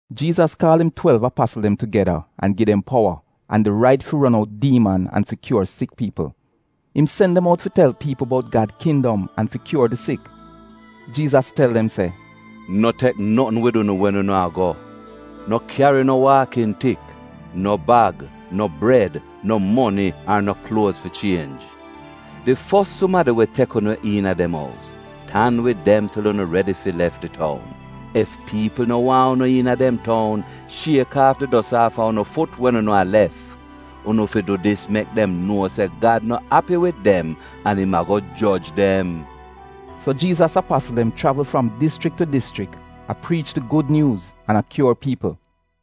Jiizas kaal im twelv apasl dem tugeda an gi dem powa an di rait fi ron out diiman an fi kyuor sik piipl. Im sen dem out fi tel piipl bout Gad kindom an fi kyuor di sik. Jiizas tel dem se: “No tek notn wid unu wen unu a go; no kyari no waakn tik, no bag, no bred, no moni ar no kluoz fi chienj. Di fos sumadi we tek unu iina dem ous, tan wid im til unu redi fi lef di toun. Ef piipl no waahn unu iina dem toun, shiek aaf di dos aafa unu fut wen unu a lef. Unu fi du dis mek dem nuo se Gad no api wid dem an im ago joj dem.” So Jiizas apasl dem chravl fram dischrik tu dischrik, a priich di Gud Nyuuz an a kyuor piipl.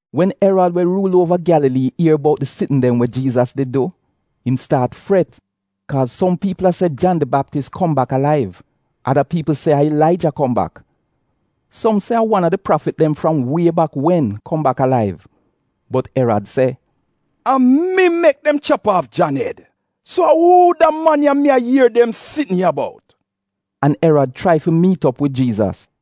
Wen Erad we ruul uova Gyalalii, ier bout di sitn dem we Jiizas did du, im staat fret, kaaz som piipl a se Jan di Baptis kom bak alaiv. Ada piipl se a Ilaija kom bak. Som se a wan a di prafit dem fram wie bak wen, kom bak alaiv. Bot Erad se, “A mi mek dem chap aaf Jan ed, so a uu da man ya mi a ier dem sitn ya bout?” An Erad chrai fi miit op wid Jiizas.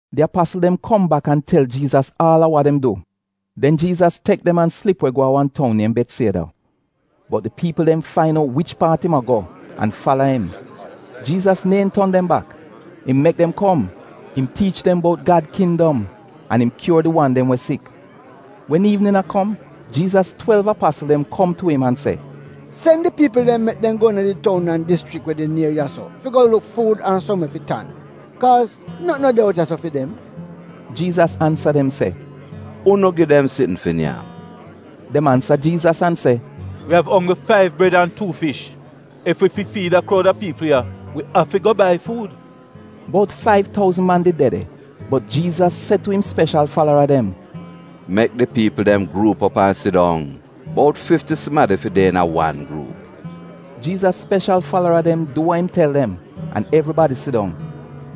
Di apasl dem kom bak an tel Jiizas aal a wa dem du. Den Jiizas tek dem an slip we go a wan toun niem Betsieda. Bot di piipl dem fain out wich paat im a go an fala im. Jiizas neehn ton dem bak, im mek dem kom, im tiich dem bout Gad kindom, an im kyuor di wan dem we sik. Wen iivnin a kom, Jiizas twelv apasl dem kom tu im an se, “Sen di piipl dem mek dem go iina di toun an dischrik we de nier ya-so, fi go luk fuud an som we fi tan. Kaaz notn no de out ya fi dem.” Jiizas ansa dem se, “Unu gi dem sitn fi nyam.” Dem ansa Jiizas an se, “Wi av onggl faiv bred an tuu fish. Ef wi fi fiid da kroud a piipl ya, wi afi go bai fuud. (Bout faiv touzn man did de de.) Bot Jiizas se tu im speshal falara dem, “Mek di piipl dem gruup op an sidong. Bout fifti sumadi fi de iina wan gruup.” Jiizas speshal falara dem du wa im tel dem, an evribadi sidong.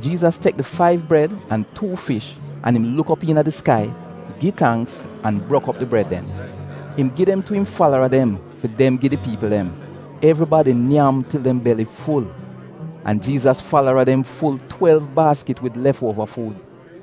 Jiizas tek di faiv bred an tuu fish an im luk op iina di skai, gi tangks an brok op di bred dem. Im gi dem tu im falara dem, fi dem gi di piipl dem. Evribadi nyam til dem beli ful, an Jiizas falara dem ful twelv baaskit wid lef uova fuud.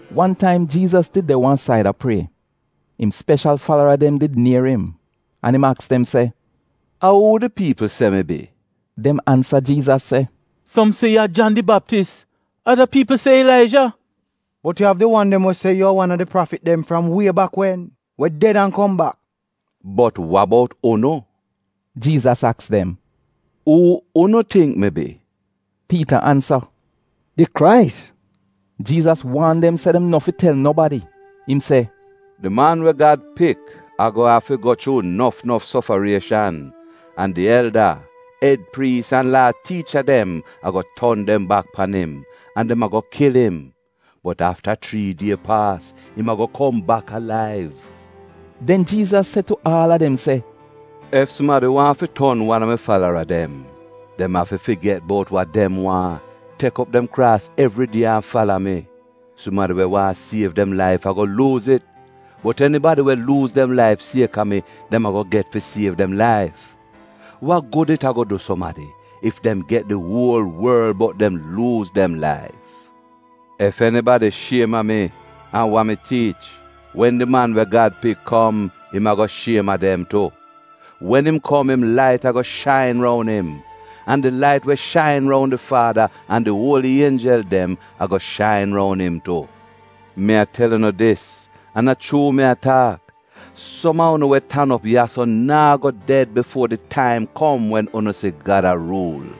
Wan taim Jiizas did de wan said a prie. Im speshal falara dem di nier im an im aks dem se, “A uu di piipl se mi bi?” Dem ansa Jiizas se, “Som se yu a Jan di Baptis, ada piipl se Ilaija, bot yu av di wan dem we se yu a wan a di prafit dem fram wie bak wen, we ded an kom bak.” “Bot wa bout unu?” Jiizas aks dem. “Uu unu tingk mi bi?” Piita ansa, “Di Krais.” Jiizas waan dem se dem no fi tel nobadi. Im se, “Di Man we Gad Pik ago a fi go chuu nof nof sofarieshan, an di elda, ed priis, an Laa tiicha dem ago ton dem bak pan im, an dem ago kil im. Bot afta chrii die paas, im ago kom bak alaiv.” Den Jiizas se tu aal a dem se: “Ef sumadi waahn fi ton wan a fi mi falara dem, dem afi figet bout wa dem waahn, tek op dem kraas evridie an fala mi. Sumadi we waahn siev dem laif ago luuz it, bot enibadi we luuz dem laif sieka mi, dem ago get fi siev dem laif. Wa gud it ago du sumadi, ef dem get di uol worl bot dem luuz dem laif. Ef enibadi shiem a mi an wa mi tiich, wen di man we Gad Pik kom, im ago shiem a dem tu. Wen im kom im lait ago shain roun im. An di lait we shain roun di Faada an di uoli ienjel dem, ago shain roun im tu. Mi a tel unu dis, an a chuu mi a taak, som a unu we tan op ya-so naa go ded bifuo di taim kom wen unu si Gad a ruul.”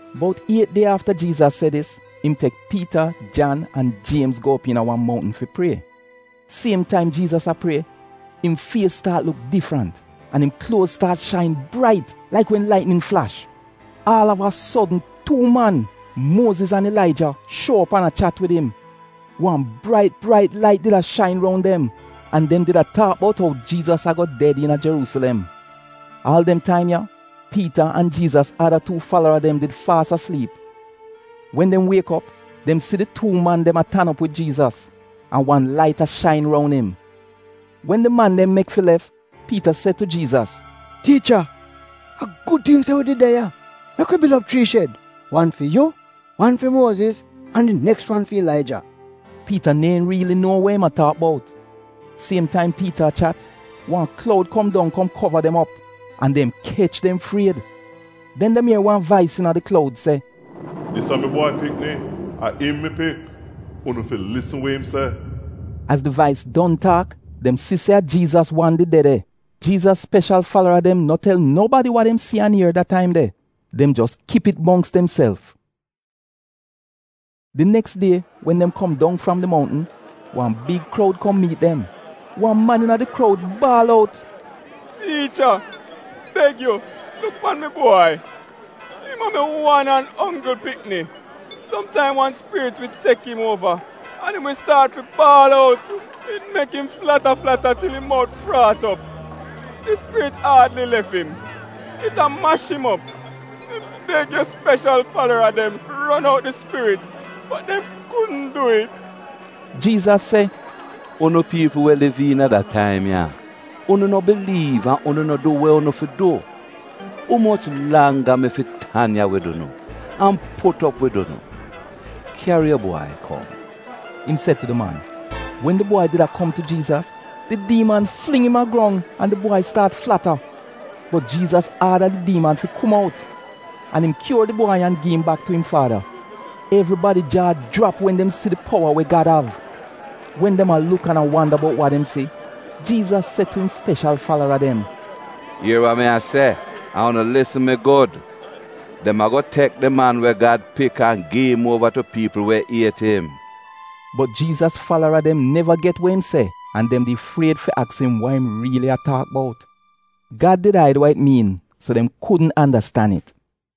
Bout iet die afta Jiizas se dis, im tek Piita, Jan an Jiemz go op iina wan moutn fi prie. Siem taim Jiizas a prie, im fies staat luk difrant, an im kluoz staat shain brait laik wen laitnin flash. Aal av a sodn tuu man, Muoziz an Ilaija, shuo op an a chat wid im. Wan brait brait lait did a shain roun dem an dem did a taak bout ou Jiizas ago ded iina Jeruusilem. Aal dem taim ya, Piita an Jiizas ada tuu falara dem did faas asliip. Wen dem wiek op, dem si di tuu man dem a tan op wid Jiizas an wan lait a shain roun im. Wen di man dem mek fi lef, Piita se tu Jiizas, “Tiicha, a gud ting se wi de ya! Mek wi bil op chrii shed, wan fi yu, wan fi Muoziz an di neks wan fi Ilaija.” (Piita neehn riili nuo wa im a taak bout.) Siem taim Piita a chat, wan kloud kom dong kom kova dem op, an dem kech dem fried. Den dem ier wan vais iina di kloud se, “Dis a mi bwai pikni, a im mi pik, unu fi lisn we im se.” Az di vais don taak, dem si se a Jiizas wan did de de. Jiizas speshal falara dem no tel nobadi wa dem si an ier da taim de, dem jos kip it mongks demself. Di neks die, wen dem kom dong fram di mountn, wan big kroud kom miit dem. Wan man iina di kroud baal out, “Tiicha, beg yu luk pan mi bwai. Im a mi wan an onggl pikni. Somtaim wan spirit wi tek im uova an im wi staat fi baal out; it mek im flata flata til im mout fraat op. Di spirit aadli lef im. It a mash im op. Mi beg yu speshal falara dem fi ron out di spirit bot dem kudn dwi'it.” Jiizas se “Unu piipl we liv iina da taim ya! Unu no biliiv an unu no du we unu fi du. Umoch langga mi fi tan ya wid unu, an put op wid unu?” “Kyari yu bwai kom,” im se tu di man. Wen di bwai did a kom tu Jiizas, di diiman fling im a grong an di bwai staat flata. Bot Jiizas aada di diiman fi kom out an im kyuor di bwai an gi im bak tu im faada. Evribadi jaa jrap wen dem si di powa we Gad av. Wen dem a luk an a wanda bout wa dem si, Jiizas se tu im speshal falara dem “Ier wa mi a se an unu lisn mi gud! Dem ago tek di Man we Gad Pik an gi im uova tu piipl we iet im.” Bot Jiizas falara dem neva get we im se an dem di fried fi aks im wa im riili a taak bout. Gad did aid wa it miin so dem kudn andastan it.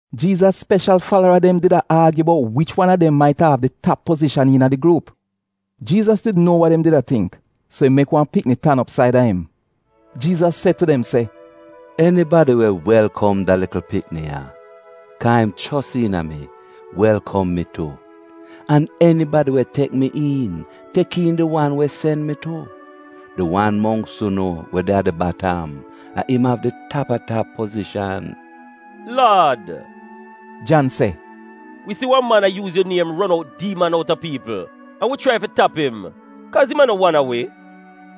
Jiizas speshal falara dem did a aagyu bout wich wan a dem maita av di tap pozishan iina di gruup. Jiizas did nuo wa dem did a tingk, so im mek wan pikni tan op saida im. Jiizas se tu dem se, “Enibadi we welkom da likl pikni ya, ka im chos iina mi, welkom mi tu. An enibadi we aksep mi, aksep di wan we sen mi tu. Di wan mongks unu we de a di batam, a im av di tap a tap pozishan.” “Laad,” Jan se, “Wi si wan man a yuuz yu niem ron out diiman outa piipl an wi chrai fi tap im, kaaz im a no wan a wi.”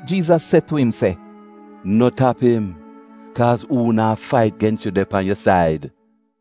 Jiizas se tu im se, “No tap im, kaaz uu naa fait gens yu de pan yu said.”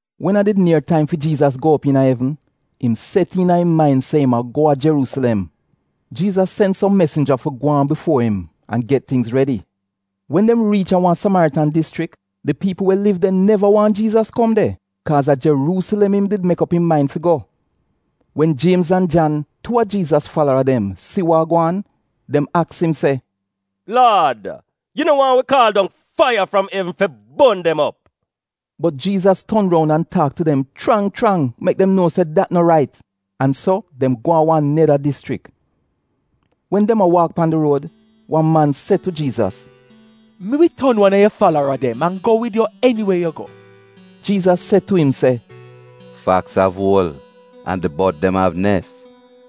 Wen a did nier taim fi Jiizas go op iina evn, im set iina im main se im a go a Jeruusilem. Jiizas sen som mesinja fi gwaan bifuo im an get tingz redi. Wen dem riich a wan Samaritan dischrik, di piipl we liv de neva waahn Jiizas kom de kaaz a Jeruusilem im did mek op im main fi go. Wen Jiemz an Jan, tuu a Jiizas falara dem, si wa a gwaan, dem aks im se, “Laad, Yu no waahn wi kaal dong faiya fram evn fi bon dem op?” Bot Jiizas ton roun an taak tu dem chrang chrang mek dem nuo se dat no rait, an so dem go a wan neda dischrik. Wen dem a waak pan di ruod, wan man se tu Jiizas, “Mi wi ton wan a yu falara dem an go wid yu eniwe yu go.” Jiizas se tu im se, “Faks av uol an di bod dem av nes,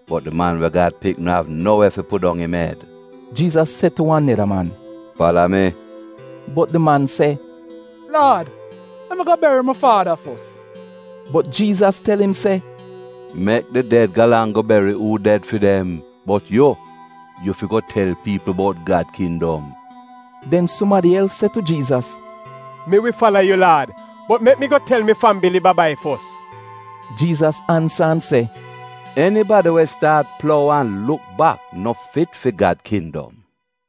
bot di Man we Gad Pik no av no we fi pudong im ed.” Jiizas se tu wan neda man, “Fala mi.” Bot di man se, “Laad, mek mi go beri mi faada fos.” Bot Jiizas tel im se, “Mek di ded galang go beri uu ded fi dem, bot yu, yu fi go tel piipl bout Gad kindom.” Den sumadi els se tu Jiizas, “Mi wi fala yu Laad, bot mek mi go tel mi fambili ba-bai fos.” Jiizas ansa an se, “Enibadi we staat plou an luk bak no fit fi Gad kindom.”